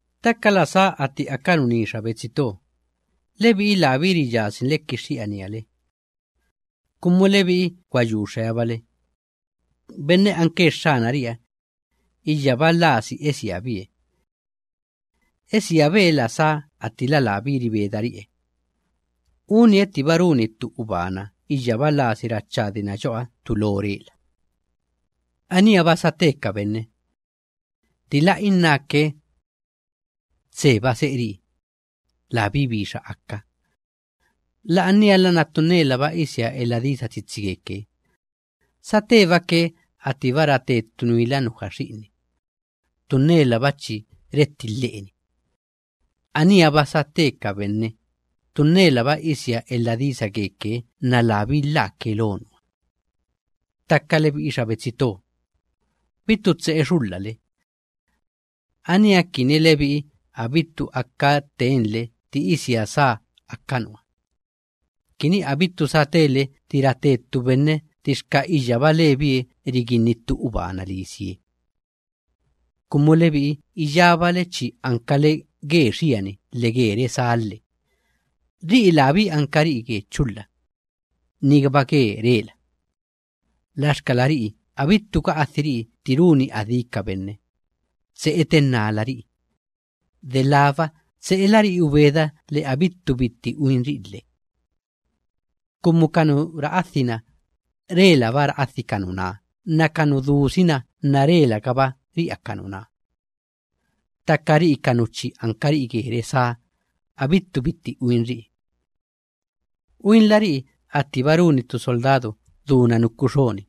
Ttaka la sá atti aka nuní xa betsi to, lebi'i labí riyasinle kixxi'ania le. Kumu lebi'i gwa yu xeabale, benne anke Xxanari'iha, iyyaba lasi esiabie. Esiabe la sá attila labí ribedari'ie, unie ttiba runi ttu ubana iyyaba lasi rachadina yo'oha ttu lo rela. Aníha‑ba sate ka benne. Ttila innáke: “Tseba se'eri'i, labí bixa aka”, la'aniala nna ttu nnelaba isia elha disa tsitsi geke, satebake attiba rate ttu nuila nuja xi'inni, ttu nnelaba chi retti lhe'eni gali xi'inni. Aníha‑ba sate ka benne, ttu nnelaba isia elha disa geke nna labí lhaake lo nuha. Ttaka lebi'i xa betsi to, bittu tse'e xulhale. Aníha kini lebi'i abittu aka tenle tti isia sá aka nuha, kini abittu satele tti rate ttu benne ttixka iyyaba lebie riginni ttu ubana lisie. Kumu lebi'i iyábale chi ankale ge xiani lhe ge resá lhe; ri'i labí ankari'i ge chulha, nigaba ge rela. Laxkala ri'i abittu ga'adhiri'i tti runi adí ka benne; tse'e tennálari'i, delába tse'elari'i ubeda lhe abittu bitti uinri'i lhe. Kumu ka nu ra'adhi‑na, relaba ra'adhi ka nuná nna ka nu dusi‑na nna relagaba ri'a ka nuná. Ttaka ri'i ka nu chi ankari'i ge resá, abittu bitti uinri'i. Uinlari'i attiba runi ttu soldadu chi duna nuku xoni,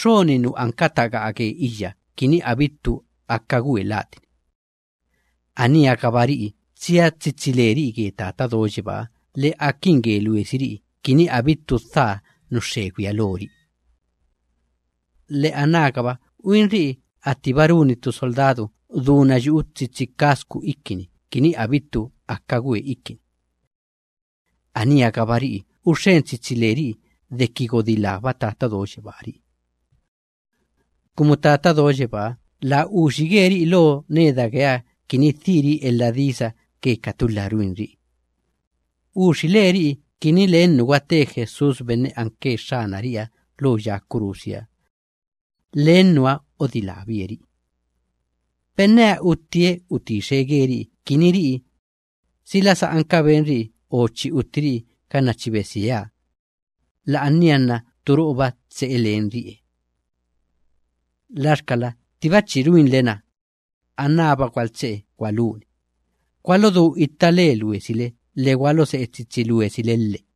xoni nu anka taga'a ge iyya kini abittu aka gwe latini ganna chi itilhana. Aníha‑gaba ri'i tsia tsitsi leri'i ge Tata Do Yebáha lhe akin ge luesiri'i kini abittu dhaa nu xxegwiha lori'i. Lhe anágaba uingabari'i attiba runi ttu soldadu chi duna yu'u tsitsi cascu ikini kini abittu aka gwe ikini ganna chi itilhana. Aníha‑gaba ri'i uxxen tsitsi leri'i deki godilába Tata Do Yebáha ri'i. Kumu Tata Do Yebáha laa uxige ri'i lo neda geeha kini dhiri'i elha disa ge ka tulha ruinri'i; uxile ri'i kini len nu gwate Jesús benne anke Xxanari'iha lo ya kurusiha, len nuha odilábie ri'i. Benneha uttie utixe geri'i kini ri'i, sila sa anka benri'i o chi uttiri'i ganna chi besieha, la'ania nna turo'oba tse'e lenri'e. Laxkala attiba chi ruinle‑na, anába gwaltse'e gwaluni, gwalodú itta le luesile lhe gwalose'e tsitsi luesile lhe.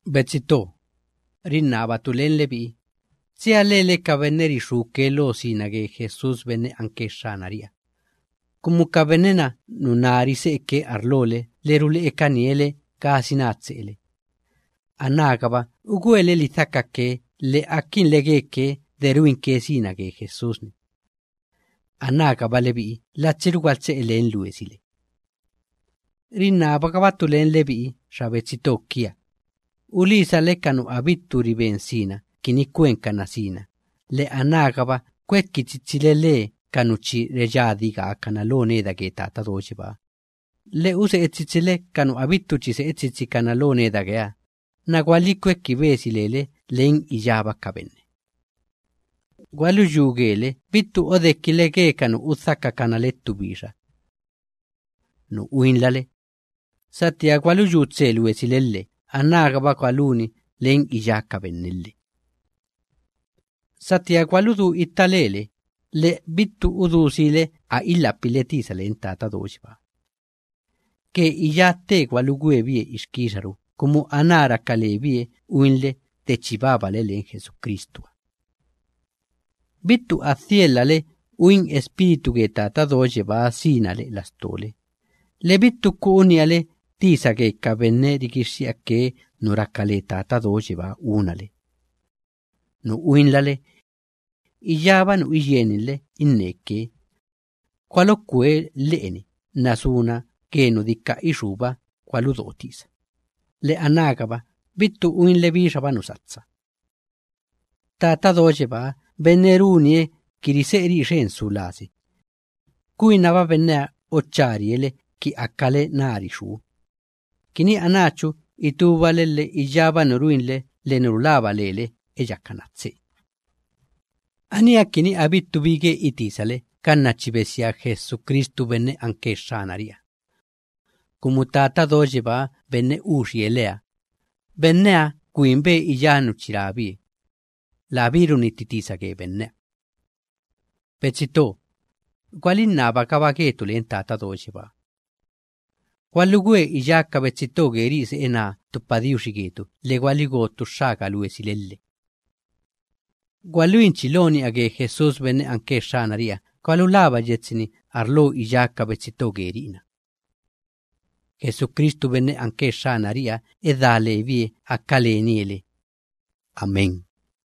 Betsi to, rinnabatu len lebi'i, tsia lele ka benne rixúke lo sina ge Jesús benne anke Xxanari'iha, kumu ka benne‑na nuná rise'eke arlole lhe rule'ekanie le gasina tse'ele. Anágaba ugwele lidhakake lhe akinle geke de ruinke sina ge Jesús‑ni. Anágaba lebi'i latsiru gwaltse'e len luesile. Rinnabagabatu len lebi'i xa betsi to kia, ulisale ka nu abittu riben sina kini kwenkana sina, lhe anágaba kweki tsitsile le ka nu chi reyadi gaakana lo neda ge Tata Do Yebáha, lhe use'e tsitsile ka nu abittu chi se'e tsitsikana lo neda geeha lhe gwalikweki besi lele len iyába ka benne. Gwaluyú gele bittu odekile ge ka nu udhakakana le ttu bixa. Nu uinlale, satía gwaluyú tse luesile lhe anágaba gwaluin len iyá ka benne lhe. Satía gwaludú itta lele lhe bittu udú siile a ilhapile tisa len Tata Do Yebáha. Ge iyá tte gwalugwe bie ixkixaru kumu aná raka lebie uinle de chi babale len Jesucristuha. Bittu a dhielhale uin Espíritu ge Tata Do Yebáha sina lhe'e lastole lhe bittu ku'u ni'ale tisa ge ka benne rigixxi'ake nu raka le Tata Do Yebáha unale. Nu uinlale, iyába nu iyieninle inneke, gwalokwe lhe'eni nna suna ge nu dika ixúba gwaludo tisa lhe anágaba bittu uinle bixaba nu satsa. Tata Do Yebaa benne runie ki rise'eri'i xen su lasi, kwinaba benneha ocharie le ki akale nari xú, kini anáchu itúbale lhe iyába nu ruinle lhe nu rulaba lele eyakana tse. Aníha kini abittu bi ge itisale ganna chi besia Jesucristu benne anke Xxanari'iha. Kumu Tata Do Yebaa benne uxie leha, benneha gwinbe iyá nu chi rabie, labí runnitti tisa ge benneha. Betsi to, gwalinnabagaba getu len Tata Do Yebáha. Gwalugwe iyá ka betsi to geri'i se'e naa ttu padiuxi getu lhe gwaligo ttu xxaga luesile lhe. Gwaluinchi lo ni'a ge Jesús benne anke Xxanari'iha gwalulaba yetsi‑ni arlo iyá ka betsi to geri'i‑na. Jesucristu benne anke Xxanari'iha edá lebie aka lenie le. Amén.